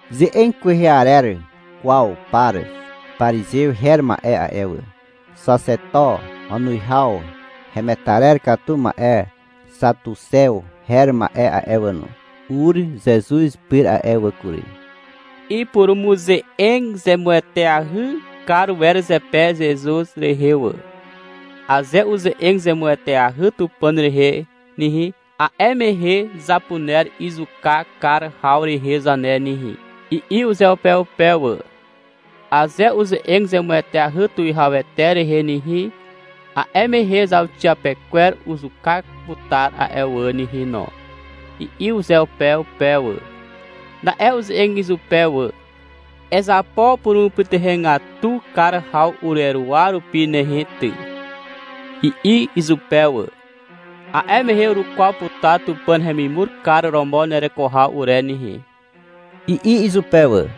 Ze'eg kwehe arer kwaw par parizew her ma'e a'e wà, xaxeto wanuwihaw hemetarer katu ma'e xatuxew her ma'e a'e wà no, ur Zezuz pyr a'e wà kury. Ipurumuze'eg zemueteahy kar wer zepe Zezuz rehe wà. — Aze uze'eg zemueteahy Tupàn rehe nehe, a'e mehe zapuner izuka kar haw rehe zane nehe, i'i uzeupeupe wà. — Aze uze'eg zemueteahy tuwihawete rehe nehe, a'e mehe zauxiapekwer uzuka putar a'e wà nehe no, i'i uzeupeupe wà. Na'e uze'eg izupe wà. — Ezapo purumupytuhegatu kar haw ureruwa rupi nehe ty, i'i izupe wà. — A'e mehe urukwaw putar Tupàn hemimur kar romo nereko haw ure nehe, i'i izupe wà.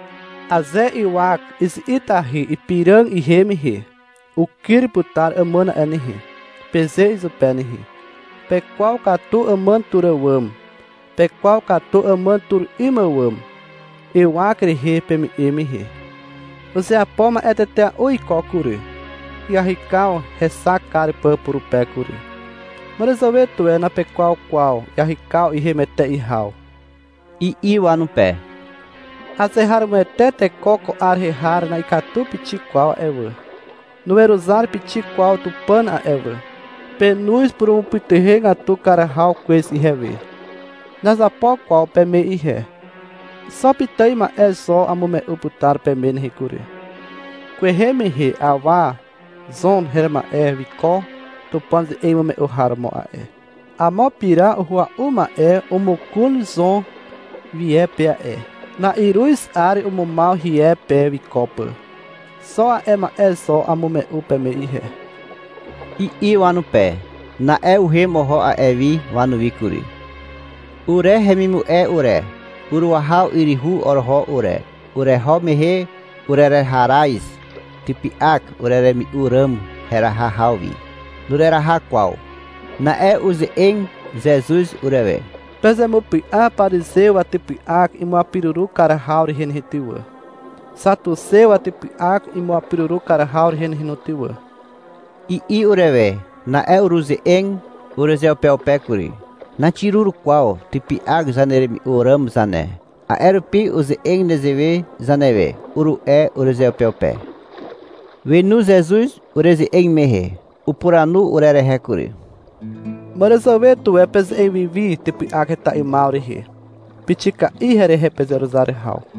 Aze ywak izi'itahy ipiràg ihem mehe, — Ukyr putar àmàn a'e nehe, peze izupe nehe. Pekwaw katu àmàn tur àwàm. Pekwaw katu àmàn tur 'ym àwàm, ywak rehe peme'e mehe. Uzeapo ma'e tetea'u iko kury, iahykaw hexak kar pà purupe kury. Màràzàwe tuwe napekwaw kwaw iahykaw ihem etea'i haw, i'i wanupe. — Azeharomoete teko ko 'ar rehe har na'ikatu pixik kwaw a'e wà. Nuweruzar pixik kwaw Tupàn a'e wà. Penoz purumupytuhegatu kar haw kwez ihewe. Nazapo kwaw peme ihe. Xo pitài ma'e zo amume'u putar peme nehe kury. — Kwehe mehe awa Zon her ma'e wiko Tupàn ze'eg imume'u har romo a'e. Amo pira uhua'u ma'e omokon Zon wie pe a'e. Na'iruz 'ar umumaw hie pe wiko pà. Xo a'e ma'e zo amume'u peme ihe, i'i wanupe. Na'e uhem oho a'e wi wanuwi kury. Ure hemimu'e ure, uruahaw yryhu oroho ure. Ureho mehe urereharaz typy'ak ureremi'u ràm heraha haw wi. Nureraha kwaw. Na'e uze'eg Zezuz urewe. — Pezemupy'a parizew watypy'ak imuapiruru kar haw rehe nehe ty wà, xatuxew watypy'ak imuapiruru kar haw rehe nehe no ty wà, i'i urewe. Na'e uruze'eg urezeupeupe kury. — Naxirur kwaw typy'ak zaneremi'u ràm zane, a'e rupi uze'eg nezewe zanewe, uru'e urezeupeupe. Wenu Zezuz ureze'eg mehe. Upuranu urerehe kury. — Màràzàwe tuwe peze'eg wi wi typy'ak heta 'ymaw rehe. Pixika'i herehe pezeruzar haw.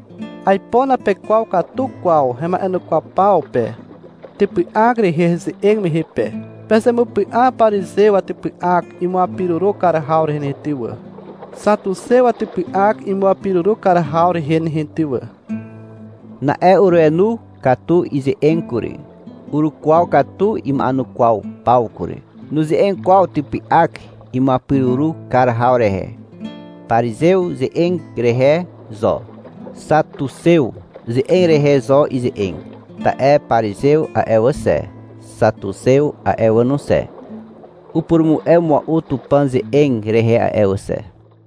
Aipo napekwaw katu kwaw hema'enukwaw paw pe, typy'ak rehe heze'eg mehe pe. Pezemupy'a parizew watypy'ak imuapiruru kar haw rehe ty wà, xatuxew watypy'ak imuapiruru kar haw rehe nehe ty wà. Na'e urenu katu ize'eg kury, urukwaw katu ima'enukwaw paw kury. Nuze'eg kwaw typy'ak imuapiruru kar haw rehe. Parizew ze'eg rehe zo, xatuxew ze'eg rehe zo ize'eg. Ta'e parizew a'e wà xe, xatuxew a'e wà no xe, upurumu'e mua'u Tupàn ze'eg rehe a'e wà xe.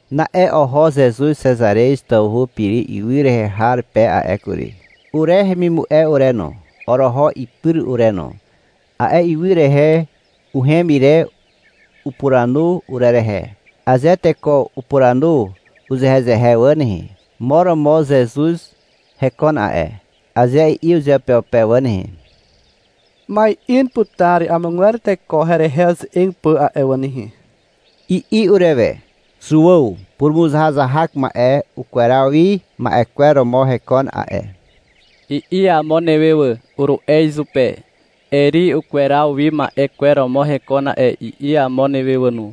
Na'e oho Zezuz Xezarez tawhu Piri ywy rehe har pe a'e kury. (Ure hemimu'e ure no, oroho ipyr ure no.) A'e ywy rehe uhem ire upuranu urerehe. — Aze teko upuranu uzehezehe wà nehe, — Mo romo Zezuz hekon a'e, aze i'i uzeupeupe wà nehe, ma'in putar amogwer teko herehe uze'eg pà a'e wà nehe, i'i urewe. — Zuàw purumuzahazahak ma'e ukweraw wi ma'e kwer romo hekon a'e, i'i amo newe wà, uru'e izupe. — Eri ukweraw wi ma'e kwer romo hekon a'e, i'i amo newe wà no.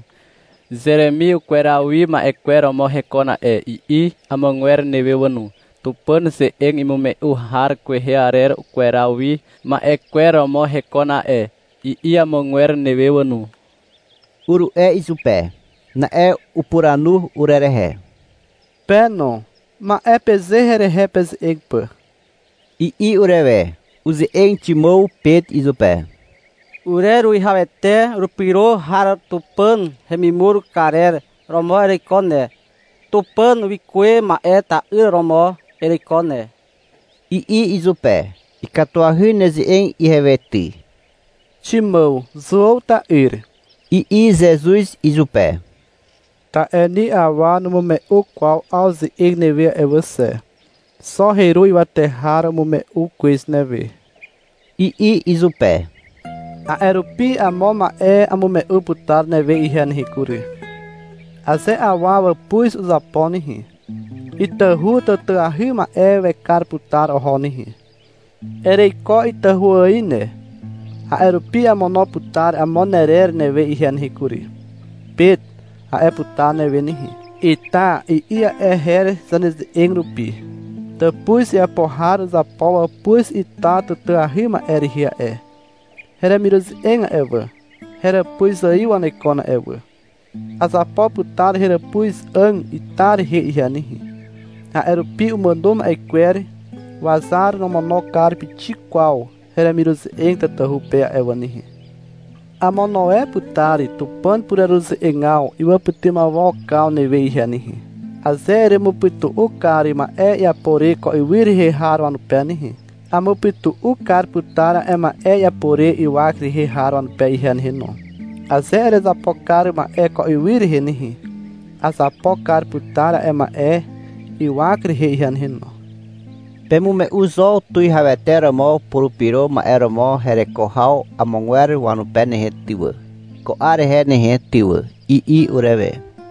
— Zeremi ukweraw wi ma'e kwer romo hekon a'e, i'i amogwer newe wà no. — Tupàn ze'eg imume'u har kwehe arer ukweraw wi ma'e kwer romo hekon a'e, i'i amogwer newe wà no, uru'e izupe. Na'e upuranu urerehe. — Pe no, ma'e peze herehe peze'eg pà, i'i urewe. Uze'eg Ximàw Pet izupe. — Ureruwihawete urepyro har Tupàn hemimur karer romo ereiko ne, Tupàn wikuwe ma'e ta'yr romo ereiko ne, i'i izupe. — Ikatuahy neze'eg ihewe ty, Ximàw, Zuàw ta'yr, i'i Zezuz izupe. — Ta'e ni awa numume'u kwaw 'aw ze'eg newe a'e wà xe. Xo heru ywate har umume'u kwez newe, i'i izupe. — A'e rupi amo ma'e amume'u putar newe ihe nehe kury. — Aze awa wàpuz uzapo nehe, itahu tàtàahy ma'e wekar putar oho nehe. Ereiko itahu ài ne. A'e rupi amono putar amo nerer newe ihe nehe kury. — Pet, a'e putar newe nehe. (— Ita, i'i a'e her zaneze'eg rupi.) Tàpuz iapo har uzapo wàpuz ita tàtàahy ma'e rehe a'e. Heremiruze'eg a'e wà, heràpuz ài wanekon a'e wà. Azapo putar heràpuz 'àg ita rehe ihe nehe. A'e rupi umàno ma'e kwer wazar nomono kar pixik kwaw heremiruze'eg tatahu pe a'e wà nehe. — Amono e putar Tupàn pureruze'egaw iwàpytymawokaw newe ihe nehe. Aze eremupytu'u kar ma'e iapo re ko ywy rehe har wanupe nehe, amupytu'u kar putar a'e ma'e iapo re ywak rehe har wanupe ihe nehe no. Aze erezapo kar ma'e ko ywy rehe nehe, azapo kar putar a'e ma'e a'e ywak rehe ihe nehe no. — Pemume'u zo Tuwihawete romo Purupyro Ma'e romo hereko haw amogwer wanupe nehe ty wà, ko 'ar rehe nehe ty wà, i'i urewe.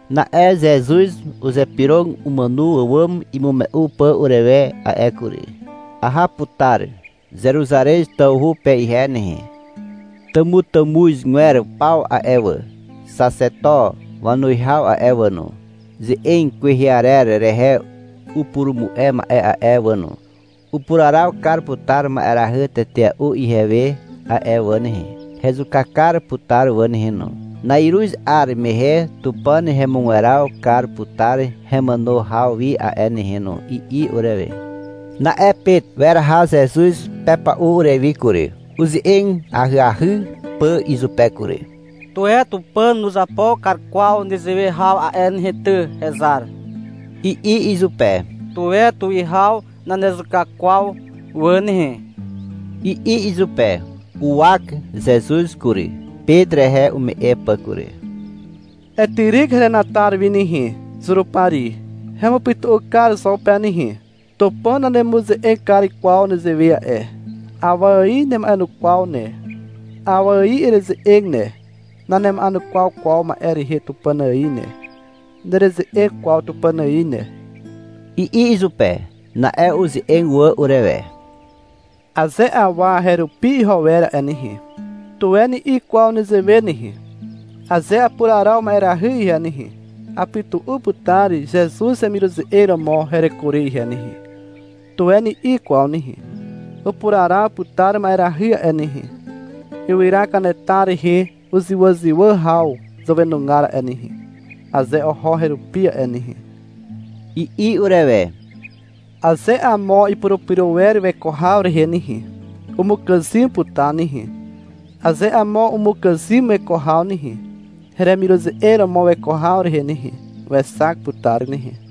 Na'e Zezuz uzypyrog umàno àwàm imume'u pà urewe a'e kury. — Aha putar Zeruzarez tawhu pe ihe nehe. Tàmutàmuzgwer paw a'e wà, xaxeto wanuwihaw a'e wà no, ze'eg kwehe arer rehe upurumu'e ma'e a'e wà no, upuraraw kar putar ma'erahy tetea'u ihewe a'e wà nehe. Hezuka kar putar wà nehe no. Na'iruz 'ar mehe Tupàn hemugweraw kar putar hemàno haw wi a'e nehe no, i'i urewe. Na'e Pet weraha Zezuz pepa'u urewi kury, uze'eg ahyahy pà izupe kury. — Tuwe Tupàn nuzapo kar kwaw nezewe haw a'e nehe ty, hezar, i'i izupe. — Tuwe tuwihaw nanezuka kwaw wà nehe, i'i izupe. Uwak Zezuz kury, Pet rehe ume'e pà kury. — Etyryk herenatar wi nehe, Zurupari. Hemupytu'u kar zo pe nehe. Tupàn nanemuze'eg kar kwaw nezewe a'e. Awa ài nema'enukwaw ne, awa ài ereze'eg ne. Nanema'enukwaw kwaw ma'e rehe Tupàn ài ne. Nereze'eg kwaw Tupàn ài ne, i'i izupe. Na'e uze'eg wà urewe. — Aze awa herupi iho wer a'e nehe, tuwe ni'i kwaw nezewe nehe, — Aze apuraraw ma'erahy ihe nehe, apytu'u putar Zezuz hemiruze'eg romo hereko re ihe nehe, tuwe ni'i kwaw nehe. Upuraraw putar ma'erahy a'e nehe, ywyra kanetar rehe uzywàzywà haw zàwenugar a'e nehe, aze oho herupi a'e nehe, i'i urewe. Aze amo ipurupyro wer weko haw rehe nehe, umukàzym putar nehe. Aze amo umukàzym weko haw nehe, heremiruze'eg romo weko haw rehe nehe, wexak putar nehe.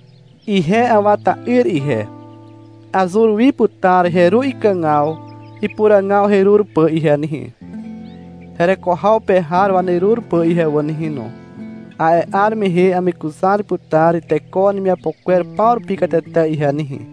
Ihe Awa ta'yr ihe, azur wi putar heru ikàgaw ipuràgaw herur pà ihe nehe, hereko haw pe har wanerur pà ihe wà nehe no. A'e 'ar mehe amekuzar putar teko wanemiapo kwer paw rupi katete ihe nehe.